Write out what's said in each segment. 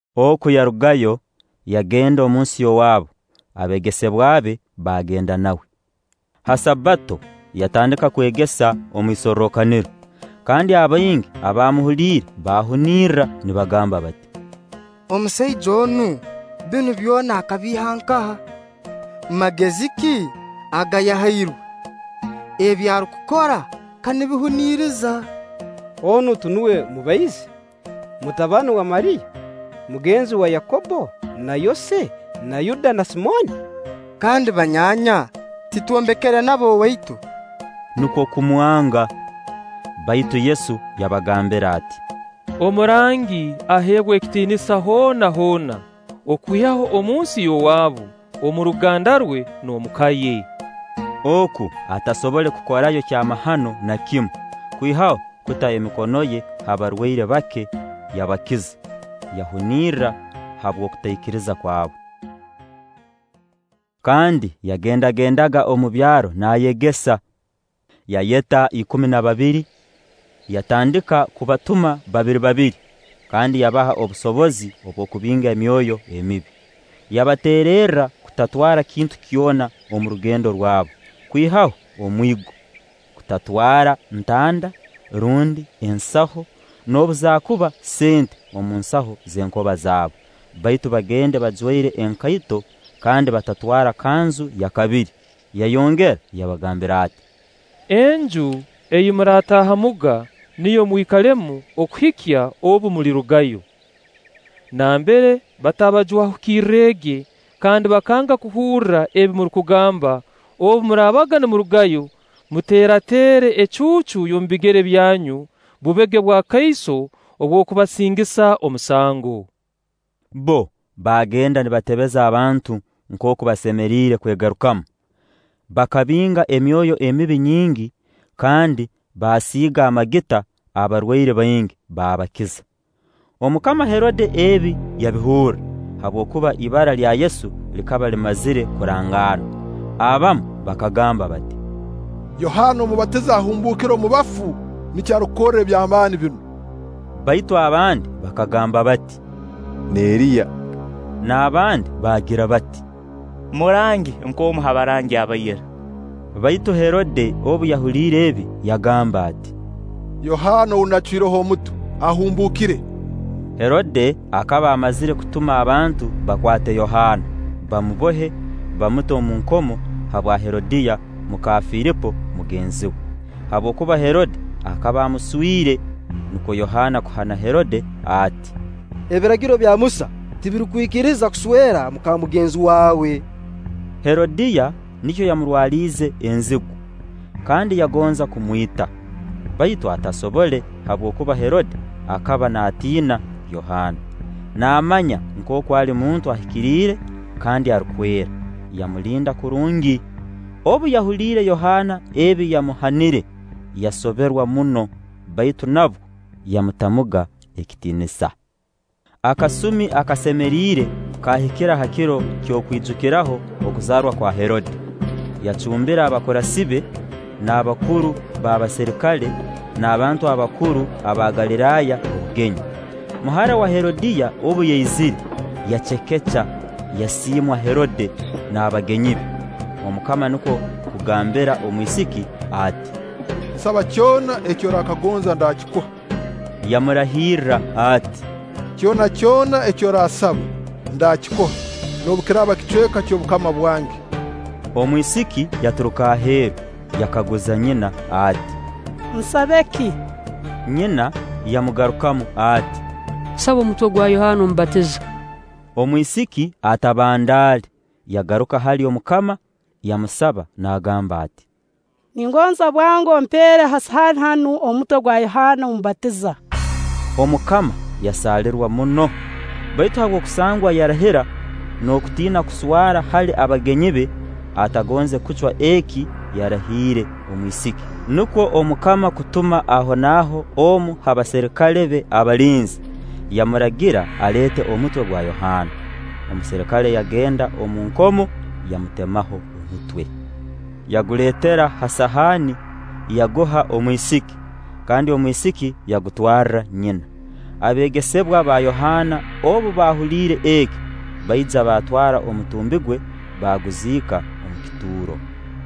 Oku yarugayo, yagenda omunsi y'owaabu; abeegesebwa be baagenda nawe. Ha Sabbato yatandika kwegesa omu isorrokaniro; kandi abaingi abaamuhuliire baahunirra nibagamba bati: “Omusaija onu, binu byona akabiiha nkaha? Magezi ki aga yahairwe? Ebi arukukora ka nibihuniriza! Onu tinuwe mubaizi, mutabani wa Mariya, mugenzi wa Yakobbo na Yose na Yuda na Simooni; kandi banyaanya titwombekere nabo owaitu?” Nukwo kumwanga. Baitu Yesu yabagambira ati: “Omurangi aheebwa ekitiinisa hoona hoona, okwihaho omunsi y'owaabu, omu ruganda rwe, n'omuka ye.” Oku atasobole kukorayo kyamahano na kimu, kwihaho kuta emikono ye ha barwaire bake, yabakiza. Yahunirra habw'okutaikiriza kwabo. Kandi yagendagendaga omu byaro naayegesa. Yayeta ikumi na babiri, yatandika kubatuma babiri babiri, kandi yabaha obusobozi bw'okubinga emyoyo emibi. Yabateererra kutatwara kintu kyona omu rugendo rwabo, kwihaho omwigo; kutatwara ntanda, rundi ensaho, noobu zaakuba sente omu nsaho z'enkoba zaabo; baitu bagende bajwaire enkaito, kandi batatwara kanzu ya kabiri. Yayongera yabagambira ati: “Enju ei murataahamuga, niyo mwikalemu okuhika obu mulirugayo. Nambere bataabajwahukirrege kandi bakanga kuhurra ebi murukugamba, obu muraabaga nimurugayo, muteerateere ecuucu y'omu bigere byanyu, bubege bwakaiso obw'okubasingisa omusango.” Bbo baagenda nibatebeza abantu nkooku basemeriire kwegarukamu. Bakabinga emyoyo emibi nyingi, kandi baasiiga amagita abarwaire baingi, baabakiza. Omukama Herode ebi yabihurra, habwokuba ibara lya Yesu likaba limazire kurangaanwa. Abamu bakagamba bati: “Yohaana Omubatiza ahumbuukire omu bafu, nikyo arukukorra eby'amaani binu.” Baitu abandi bakagamba bati: “N'Eriya.” N'abandi bagira bati: “Murangi, nk'omu ha barangi aba ira.” Baitu Herode obu yahuliire ebi, yagamba ati: “Yohaana ou naacwireho omutwe, ahumbuukire.” Herode akaba amazire kutuma abantu bakwate Yohaana, bamubohe, bamute omu nkomo habwa Herodiya muka Filipo mugenzi we; habwokuba Herode akaba amuswire. Nukwo Yohaana kuhana Herode ati: “Ebiragiro bya Musa tibirukukwikiriza kuswera muka mugenzi waawe.” Herodiya nikyo yamurwaliize enzigu, kandi yagonza kumwita; baitu atasobole, habwokuba Herode akaba naatiina Yohaana, naamanya nkooku ali muntu ahikiriire kandi arukwera; yamulinda kurungi. Obu yahuliire Yohaana ebi yamuhanire, yasoberwa muno; baitu nabwo yamutamuga ekitiinisa. Akasumi akasemeriire kaahikira ha kiro ky'okwijukiraho okuzaarwa kwa Herode, yacumbira abakurasi be, n'abakuru b'abaserikale, n'abantu abakuru aba Galiraaya obugenyi. Muhara wa Herodiya obu yaizire, yacekeca, yasiimwa Herode n'abagenyi be. Omukama nukwo kugambira omwisiki ati: “Nsaba kyona eki orakagonza, ndaakikuha.” Yamurahira ati: “Kyona kyona eki oransaba, ndaakikuha, noobu kiraaba ekicweka ky'obukama bwange.” Omwisiki yaturuka aheeru, yakaguza nyina ati: “Nsabe ki?” Nyina yamugarukamu ati: “Saba omutwe gwa Yohaana Omubatiza.” Omwisiki atabandaale yagaruka hali omukama, yamusaba naagamba ati: “Ningonza bwango ompeere ha sahaani hanu omutwe gwa Yohaana Omubatiza.” Omukama yasaalirwa muno; baitu habw'okusangwa yarahira, n'okutiina kuswara hali abagenyi be, atagonze kucwa eki yarahiire omwisiki. Nukwo omukama kutuma ahonaaho omu ha baserikale be abalinzi, yamuragira aleete omutwe gwa Yohaana. Omuserikale yagenda omu nkomo, yamutemaho omutwe, yaguleetera ha sahaani, yaguha omwisiki; kandi omwisiki yagutwarra nyina. Abeegesebwa ba Yohaana obu baahuliire eki, baija baatwara omutumbi gwe, baaguziika omu kituuro.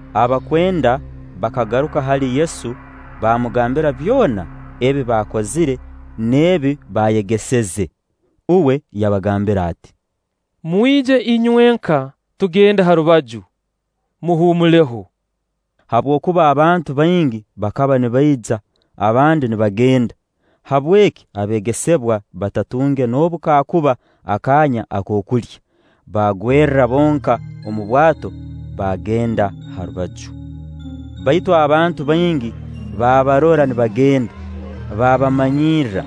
Abakwenda bakagaruka hali Yesu baamugambira byona ebi baakozire n'ebi baayegeseze. Uwe yabagambira ati: “Mwije inywenka tugende ha rubaju, muhuumuleho”; habwokuba abantu baingi bakaba nibaija, abandi nibagenda; habweki abeegesebwa batatunge noobu kaakuba akaanya ak'okulya. Baagwerra bonka omu bwato, baagenda ha rubaju. Baitu abantu baingi baabarora nibagenda, baabamanyirra;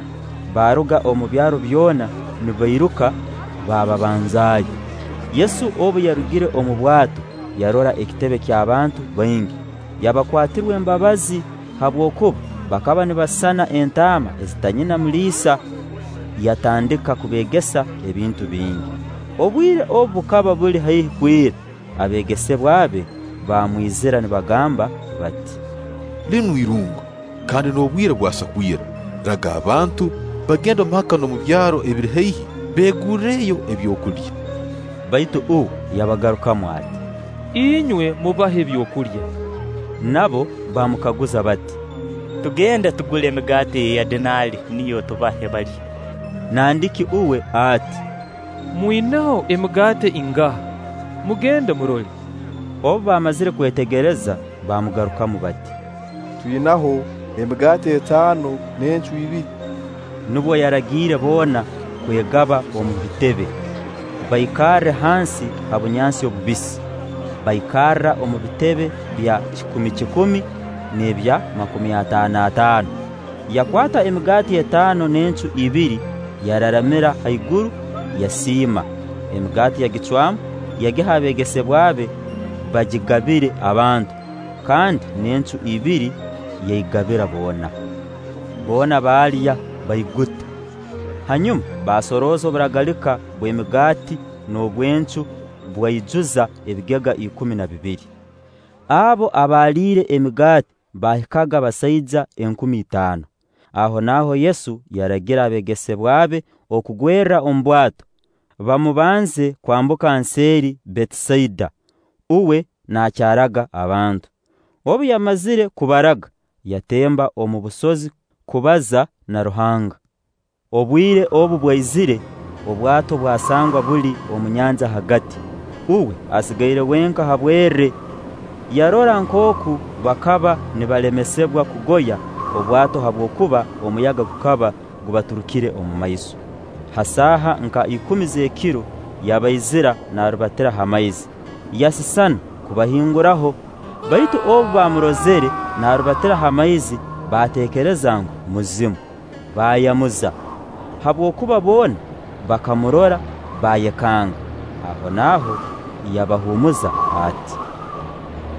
baaruga omu byaro byona nibairuka baababanzaayo. Yesu obu yarugire omu bwato yarora ekitebe ky'abantu baingi, yabakwatirwa embabazi, habwokuba bakaba nibasisana entaama ezitaina muliisa; yatandika kubeegesa ebintu bingi. Obwire obu bukaba buli haihi kwira, abeegesebwa be baamwizira nibagamba bati: “Linu irungu, kandi n'obwire bwasa kwira; raga abantu, bagende omu maka n'omu byaro ebiri haihi, beegurreyo ebyokulya.” Baitu uwe yabagarukamu ati: “Inywe mubahe ebyokulya.” Nabo baamukaguza bati: “Tugende tugule emigaati ya edinaali, niyo tubahe balye?” Nandiki uwe ati: “Mwinaho emigaati ingaha? Mugende murole.” Obu baamazire kwetegereza, baamugarukamu bati: “Twinaho emigaati etaano n'encu ibiri.” Nubwo yaragiire boona kwegaba omu bitebe, baikarre hansi ha bunyansi obubisi. Baikarra omu bitebe bya kikumi-kikumi n'ebya makumi ataano-ataano. Yakwata emigaati etaano n'encu ibiri, yararamira ha iguru, yasiima; emigaati yagicwamu, yagiha abeegesebwa be bagigabire abantu; kandi n'encu ibiri yaigabira boona. Boona baalya, baiguta. Hanyuma baasorooza oburagalika bw'emigaati n'obw'encu bwaijuza ebigega ikumi na bibiri. Abo abaaliire emigaati baahikaga basaija enkumi itaano. Ahonaaho Yesu yaragira abeegesebwa be okugwerra omu bwato, bumabanze kwambuka nseeri Betisaida, uwe nakyaraga abantu. Obu yamazire kubaraga, yatemba omu busozi kubaza na Ruhanga. Obwire obu bwaizire, obwato bwasangwa buli omu nyanja hagati, uwe asigaire wenka ha bwerre. Yarora nkooku bakaba nibalemesibwa kugoya obwato habwokuba omuyaga gukaba gubaturukire omu maiso. Ha saaha nka ikumi z'ekiro yabaizira naarubatira ha maizi. Yasisana kubahinguraho, baitu obu baamurozire naarubatira ha maizi, baatekereza ngu muzimu, baayamuza; habwokuba boona bakamurora, baayekanga. Ahonaaho yabahuumuza ati: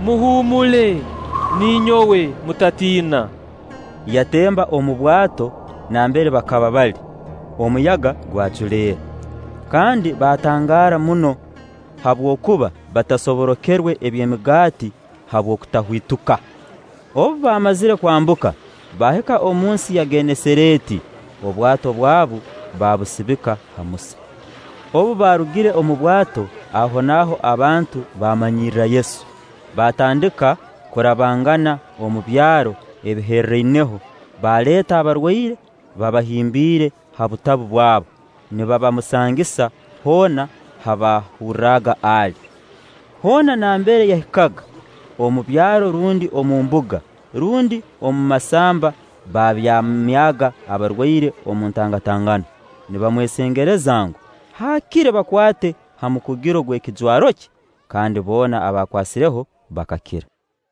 “Muhuumule, ninyowe; mutatiina.” Yatemba omu bwato nambere bakaba bali; omuyaga gwaculeera. Kandi baatangaara muno; habwokuba batasoborokerwe eby'emigaati habw'okutahwituka. Obu baamazire kwambuka, baahika omu nsi ya Genesareeti; obwato bwabu baabusibika ha musa. Obu baarugire omu bwato, ahonaaho abantu baamanyirra Yesu, baatandika kurabangana omu byaro ebiherraineho, baaleeta abarwaire, babahimbiire ha butabu bwabu, nibabamusangisa hoona ha baahurraga ali. Hoona nambere yahikaga, omu byaro rundi omu mbuga rundi omu masamba baabyamyaga abarwaire omu ntangatangano, nibamwesengereza ngu, haakire bakwate ha mukugiro gw'ekijwaro kye; kandi boona abaakwasireho bakakira.